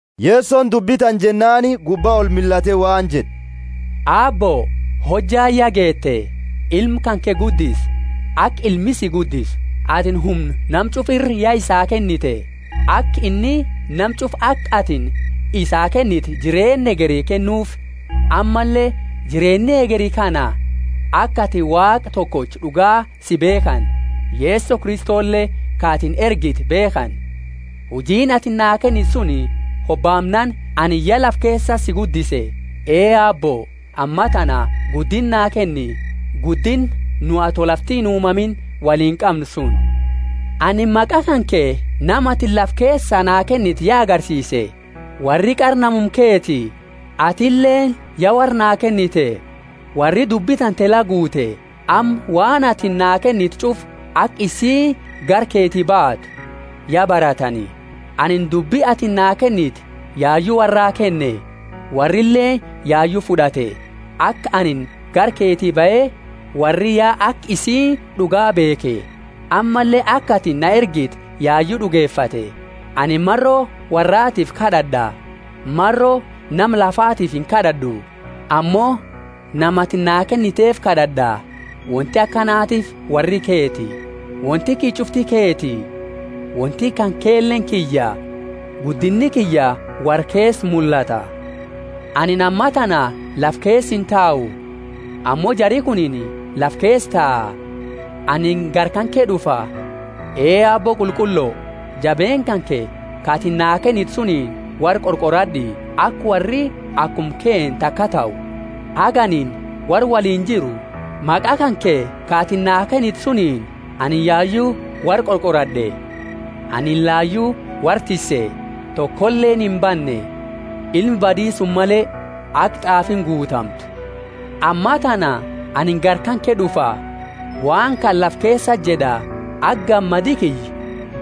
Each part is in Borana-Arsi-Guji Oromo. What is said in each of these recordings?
Yesoni dubbi tana jennaani gubba olmillate waan jed'e, Aabbo, hojjaani ya geete. Ilma kanke guddisi, aka Ilmi si guddisu. Atini humna nama ch'ufa ira ya isaa kennite, aka inni nama ch'ufa ka atini isaa kennite jireenna hegeri kennuufi. Ammalle jireenni hegeri kana: aka atini Waaqa tokocha d'uga si beekhani, Yeso Kristole ka atini ergite beekhani. Huji atini naa kennite suni hobaamnaani anini ya lafa keesati si guddise. Ee Aabbo, amma tana guddinna naa kenni, guddinna nu ato lafti inuumamiini woliini qamnu suni. Anini maqa kanke nama atini lafa keesa naa kennite ya agarsiise. Worri qara namuma keti, atileeni ya worra naa kennite. Worri dubbi tante la guute, amma waan atini naa kennite ch'ufa, aka isiini gara keti baatu, ya baratani. Anini dubbi atini naa kennite yayu worraa kenne, worrileeni yayu fud'ate; aka anini gara keti bahe worri ya aka isiini d'uga beekhe, ammalle aka atini na ergite yayu d'ugefate. Anini maro worraatiifi kad'ad'a. Maro nama lafaati inkad'ad'u, ammo nama ati naa kenniteefi kad'ad'a; wonti akanatiifi worri keti. Wonti kiyya ch'ufti keti, wonti kankeleeni kiyya; guddinni kiyya worra keesa mullata. Anini amma tana lafa keesa intau, ammo jari kunini lafa keesa taa; anini gara kanke d'ufa. Ee Aabbo qulqullo jabeenna kanke ka atini naa kennite sunini worra qorqorad'i aka worri akuma kenna taka tahu. Haga anini worra woliini jiru, maqa kanke ka atini naa kennite suniini, anini yayu worra qorqorad'e. Ani layu worra tisse, tokoleeni imbanne, ilma badi suni male, aka t'aafiini guutamtu. Ammatana anini gara kanke d'ufa, waan kana lafa keesati jed'a, aka gammadi kiyya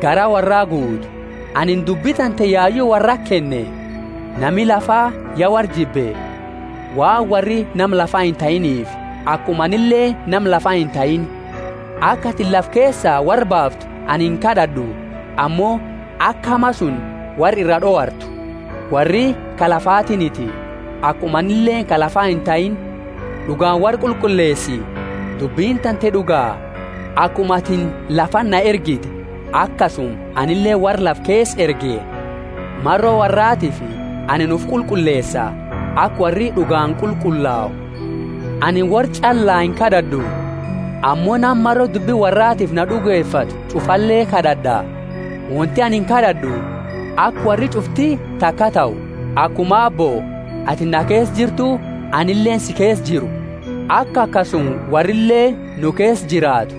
garaa worraa guutu. Anini dubbi tante yayu worrati kenne, nami lafa ya worra jibbe, waan worri nama lafa intahiiniifi, akuma anileeni nama lafa intahiini. Aka atini lafa keesaa worra baaftu anini inkad'ad'u; ammo aka hama suni worra ira d'owartu. Worri ka lafatiiniti, akuma anileeni ka lafa intahiini. D'ugaani worra qulqulleesi, dubbini tante d'uga. Akuma atini lafati na ergite, akasuma anileeni worra lafa keesa erge. Maro worraatiifi anini ufi qulqulleesa, aka worri d'ugaani qulqullau. Anini worraa ch'allaa inkad'ad'u, ammo nama maro dubbi worraatiifi na d'ugefatu ch'ufale kad'ad'a. Wonti ani kad'ad'u, aka worri ch'ufti takaa tahu, akuma Aabbo, atini na keesa jirtu, anileeni si keesa jiru, aka akasuma worrileeni nu keesa jiraatu.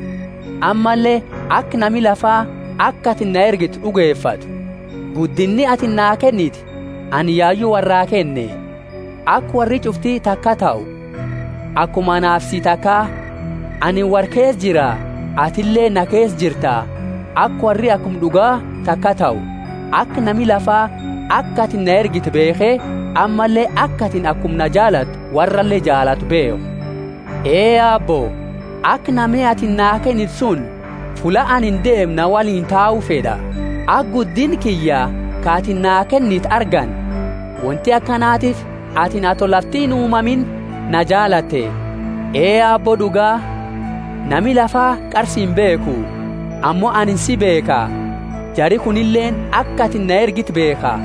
Ammalle aka nami lafa, aka atini na ergite d'ugefatu. Guddinna atini naa kennite anini yayu worraa kenne, aka worri ch'ufti takaa tahu, akuma anaafi sii takaa. Anini worra keesa jira, atinileeni na keesa jirta, aka worri akuma d'ugaa taka tahu, aka nami lafa aka atini na ergite beekhe, ammalle aka atini akuma na jaalatu worrale jaalatu beekhu. Ee Aabbo, aka nami atini naa kennite suni fulla anini deemu na woliini tau fed'a, aka guddinna kiyya ka atini naa kennite argani; wonti akanatiifi atini ato lafti inuumamiini na jaalatte. Ee Aabbo d'uga, nami lafa qara si imbeekhu, ammo anini si beekha, jari kunileeni aka atini na ergite beekha.